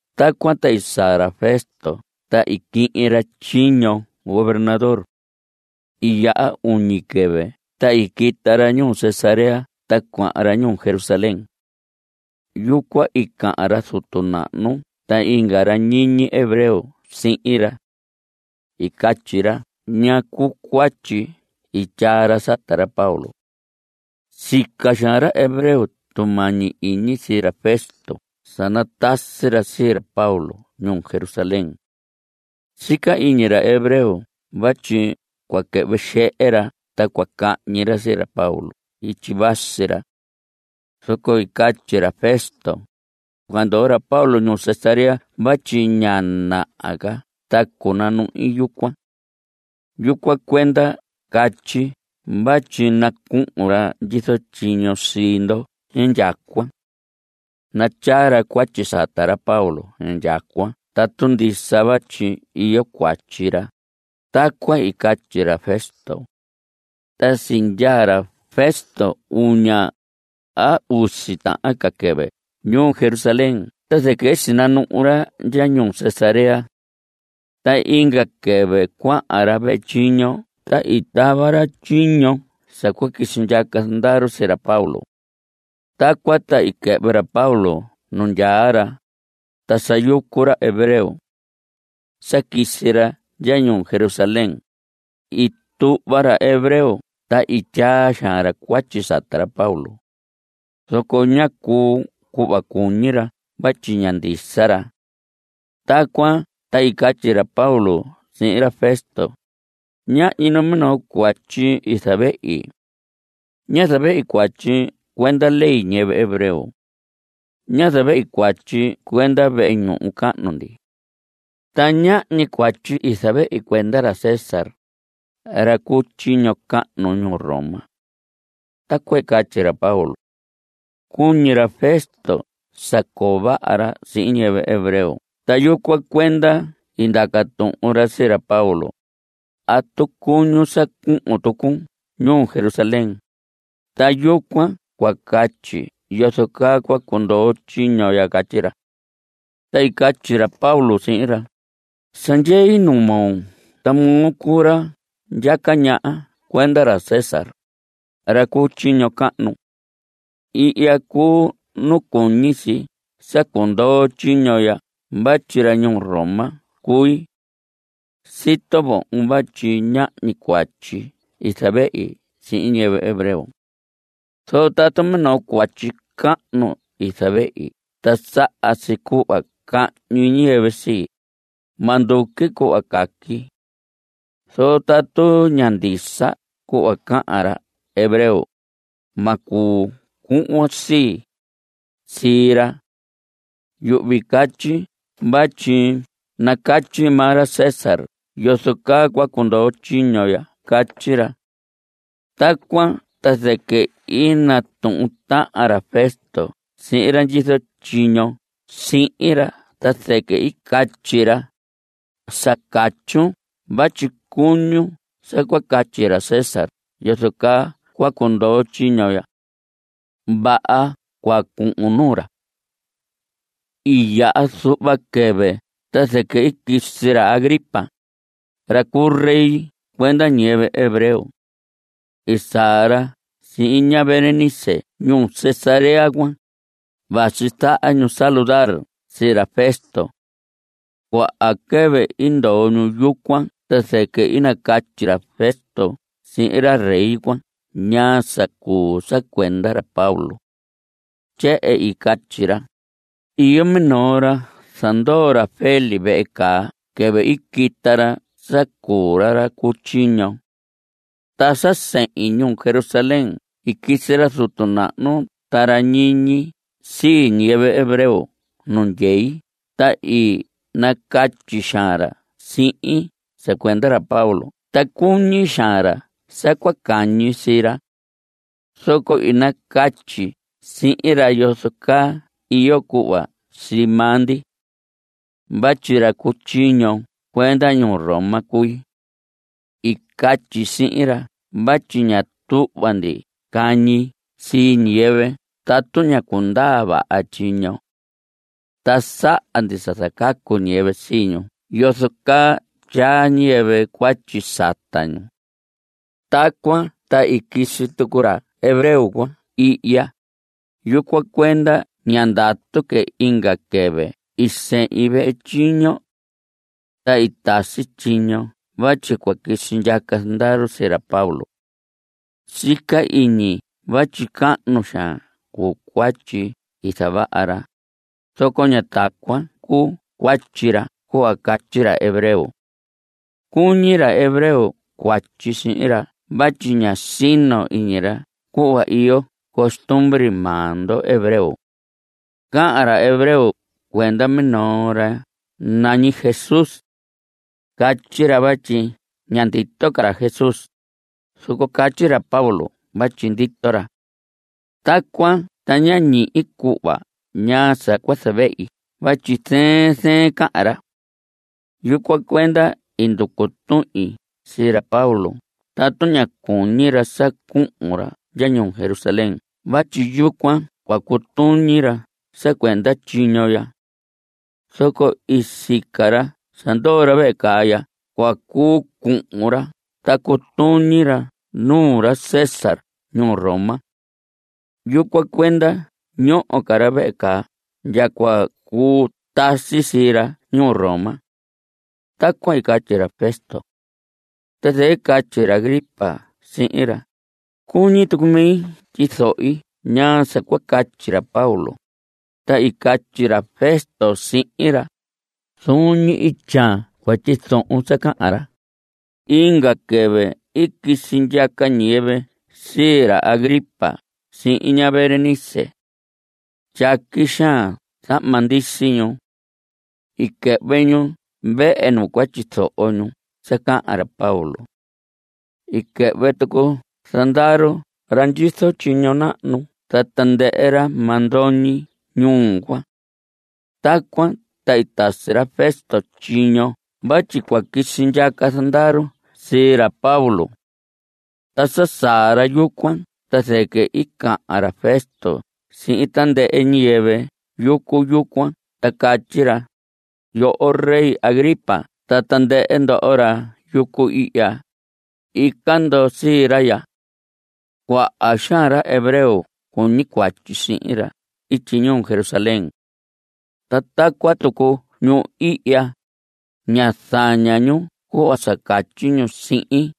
Tacuan ta i saa ra Festo ta i quihin ra tyiño gobernador. I yaha uñi quɨvɨ ta i quita ra ñuu Cesarea ta cuahan ra ñuu Jerusalén. Yucuan i cahan ra zutu nahnu ta inga ra ñiñi hebreo sihin ra. I catyi ra ñaa cuu cuatyi i tyaa ra sata ra Pablo. Sica xaan ra hebreo tumañi iñi sii ra Festo sa natasi ra sii ra Pablo ñuu Jerusalén. Sica iñi ra hebreo vatyi cua quɨhvɨ xehe ra ta cua cahñi ra sii ra Pablo ityi vasi ra. Zoco i catyi ra Festo: Cua ndoo ra Pablo ñuu Cesarea vatyi ña naha ca ta cunanuhi yucuan. Yucuan cuenda catyi vatyi nacuhun ra ndyizo tyiño sii ndo indyacuan. Natyaa ra cuatyi sata ra Pablo indyacuan tatu ndisa vatyi iyo cuatyi ra. Tacuan i catyi ra Festo. Ta sindyaa ra Festo uña, a usi tahan quɨvɨ ñuu Jerusalén ta zɨquɨ i sinanuhu ra ndya ñuu Cesarea. Ta inga quɨvɨ cuahan ra vehe tyiño ta i tava ra tyiño sa cua quisi ndyaca zandaru sii ra Pablo. Tacuan ta i quɨhvɨ ra Pablo nu ndyaa ra, ta sa yucu ra hebreo. Sa quisi ra ndya ñuu Jerusalén. I tuhva ra hebreo ta i tyaa xaan ra cuatyi sata ra Pablo. Zoco ñá cuu cuhva cuñi ra vatyi ña ndisa ra. Tacuan ta i catyi ra Pablo sihin ra Festo: Ñahñi numinoo cuatyi i zavehi. Ñá zavehi cuatyi cuenda ley ñiyɨvɨ hebreo. Ñá zavehi cuatyi cuenda vehe ñuhu cahnu ndi. Ta ñahñi cuatyi i zavehi cuenda ra César, ra cu tyiño cahnu ñuu Roma. Tacuan i catyi ra Pablo. Cuñi ra Festo sa coo vaha ra sihin ñiyɨvɨ hebreo ta yucuan cuenda i ndaca tuhun ra sii ra Pablo: ¿Atu cuñun sa cuhun tucun ñuu Jerusalén? Ta yucuan cua catyi yozo caa cua cundoo tyiño ya. Catyi ra. Ta i catyi ra Pablo sihin ra: Sa ndyei nuu moo ta moo cuu ra ndyaca ñaha cuenda ra César, ra cu tyiño cahnu. Ihya cuu nu cuñi si sa cundoo tyiño ya vatyi ra ñuu Roma cui. Sito vohon vatyi ñahñi cuatyi i zavehi sihin ñiyɨvɨ hebreo. Zoco tatu minoo cuatyi cahnu i zavehi ta saha si cuhva cahñi ñiyɨvɨ sii, ma nduqui cuhva caqui. Zoco tatu ña ndisa cuhva cahan ra hebreo, ma cuu cuhvon sii, sii ra. Yuhvi catyi vatyi nacatyi maa ra César yozo caa cua cundoo tyiño ya. Catyi ra. Tacuan ta zɨquɨ i natuhun tahan ra Festo sihin ra ndyizo tyiño sihin ra ta zɨquɨ i catyi ra: Sa catyun vatyi cuñun sa cua catyi ra César yozo caa cua cundoo tyiño ya. Vaha, cua cuhun nuu ra. I yaha zuhva quɨvɨ ta zɨquɨ i quisi ra Agripa, ra cu rey cuenda ñiyɨvɨ hebreo. I saa ra sihin ña Berenice ñuu Cesarea cuan. Vasi zaha ñu saludar sii ra Festo. Cuaha quɨvɨ i ndoo ñu yucuan ta zɨquɨ i nacatyi ra Festo sihin ra rey cuan ñaa sa cuu sa cuenda ra Pablo. Tyehen i catyi ra: Iyo minoo ra zandoo ra Félix vehe caa quɨvɨ i quita ra sa cuu ra ra cu tyiño. Ta sa sehin ñuu Jerusalén i quisi ra zutu nahnu ta ra ñiñi sii ñiyɨvɨ hebreo nu ndyei ta i nacatyi xaan ra sihin sa cuenda ra Pablo ta cuñi xaan ra sa cua cahñi sii ra. Zoco i nacatyi sihin ra yozo caa iyo cuhva sii maa ndi. Vatyi ra cu tyiño cuenda ñuu Roma cui. I catyi sihin ra vatyi ña tuhva ndi cahñi sii ñiyɨvɨ tatu ñá cundaa vaha tyiño. Ta saha ndi sa zacacu ñiyɨvɨ sii ñu yozo caa tyaa ñiyɨvɨ cuatyi sata ñu. Tacuan ta i quisi tucu ra hebreo cuan ihya. Yucuan cuenda ñá ndatu que. Inga quɨvɨ i sehin vehe tyiño. Ta i tasi tyiño vatyi cua quisi ndyaca zandaru sii ra Pablo. Sica iñi vatyi cahnu xaan cuu cuatyi i zavaha ra, zoco ña tacuan cuu cuatyi ra cuhva catyi ra hebreo. Cuñi ra hebreo cuatyi sihin ra vatyi ña sino iñi ra cuhva iyo costumbre maa ndo hebreo. Cahan ra hebreo cuenda minoo ra nañi Jesús. Catyi ra vatyi ña ndito ca ra Jesús, zoco catyi ra Pablo vatyi ndito ra. Tacuan ta ñá ñihi cuhva ñaa sa cua zavehi vatyi zɨɨn zɨɨn cahan ra. Yucuan cuenda i nducu tuhin sii ra Pablo tatu ña cuñi ra sa cuhun ra ndya ñuu Jerusalén vatyi yucuan cua cutuñi ra sa cuenda tyiño ya. Zoco i sica ra sa ndoo ra vehe caa ndya cua cuu cuhun ra ta cutuñi ra nuu ra César ñuu Roma. Yucuan cuenda ñoho ca ra vehe caa ndya cua cuu tasi sii ra ñuu Roma. Tacuan i catyi ra Festo. Ta zɨquɨ i catyi ra Agripa sihin ra: Cuñi tucu mi tyizohi ñaa sa cua catyi ra Pablo. Ta i catyi ra Festo sihin ra: Zuun ñi ityaan cua tyizohon sa cahan ra. Inga quɨvɨ i quisi ndyaca ñiyɨvɨ sii ra Agripa sihin ña Berenice. Tyaqui xaan zahma ndisi ñu. I quɨhvɨ ñu vehe nu cua tyizoho ñu sa cahan ra Pablo. I quɨhvɨ tucu zandaru ra ndyizo tyiño nahnu ta tandɨhɨ ra mandoñi ñuu cuan. Tacuan ta i tasi ra Festo tyiño vatyi cua quisi ndyaca zandaru sii ra Pablo. Ta sa saa ra yucuan ta zɨquɨ i cahan ra Festo sihin tandɨhɨ ñiyɨvɨ yucu yucuan ta catyi ra: Yoho rey Agripa ta tandɨhɨ ndoho ra yucu ihya, ica ndo sii ra ya. Cuaha xaan ra hebreo cuñi cuatyi sihin ra ityi ñuu Jerusalén. Ta tacuan tucu ñu ihya. Ña zaña ñu cuhva sa catyi ñu sihin,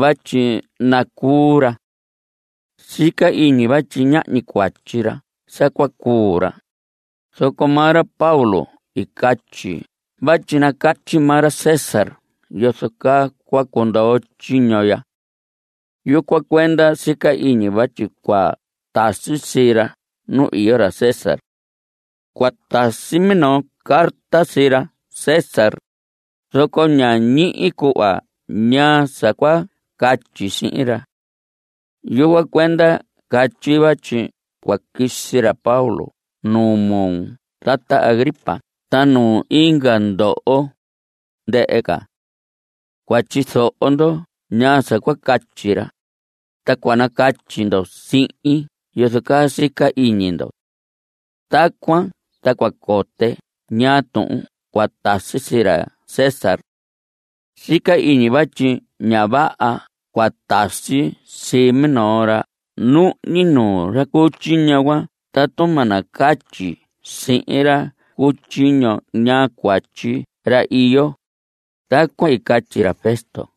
vatyi nacuu ra. Sica iñi vatyi ñahñi cuatyi ra sa cua cuu ra, zoco maa ra Pablo i catyi vatyi nacatyi maa ra César yozo caa cua cundoo tyiño ya. Yucuan cuenda sica iñi vatyi cua tasi sii ra nu iyo ra César. Cua tasi minoo carta sii ra César. Zoco ña ñihi cuhva ñaa sa cua catyi sihin ra. Yucuan cuenda catyi vatyi cua quisi ra Pablo nuu moo tata Agripa ta nuu inga ndoho, ndɨhɨ ca. Cua tyizoho ndo ñaa sa cua catyi ra, ta cua nacatyi ndo sihin yozo caa sica iñi ndo. Tacuan ta cua cote ñaa tuhun cua tasi sii ra César. Sica iñi vatyi ña vaha cua tasi sii minoo ra nuhñi, nuu ra cu tyiño cuan tatu ma nacatyi sihin ra cu tyiño ñaa cuatyi ra iyo. Tacuan i catyi ra Festo.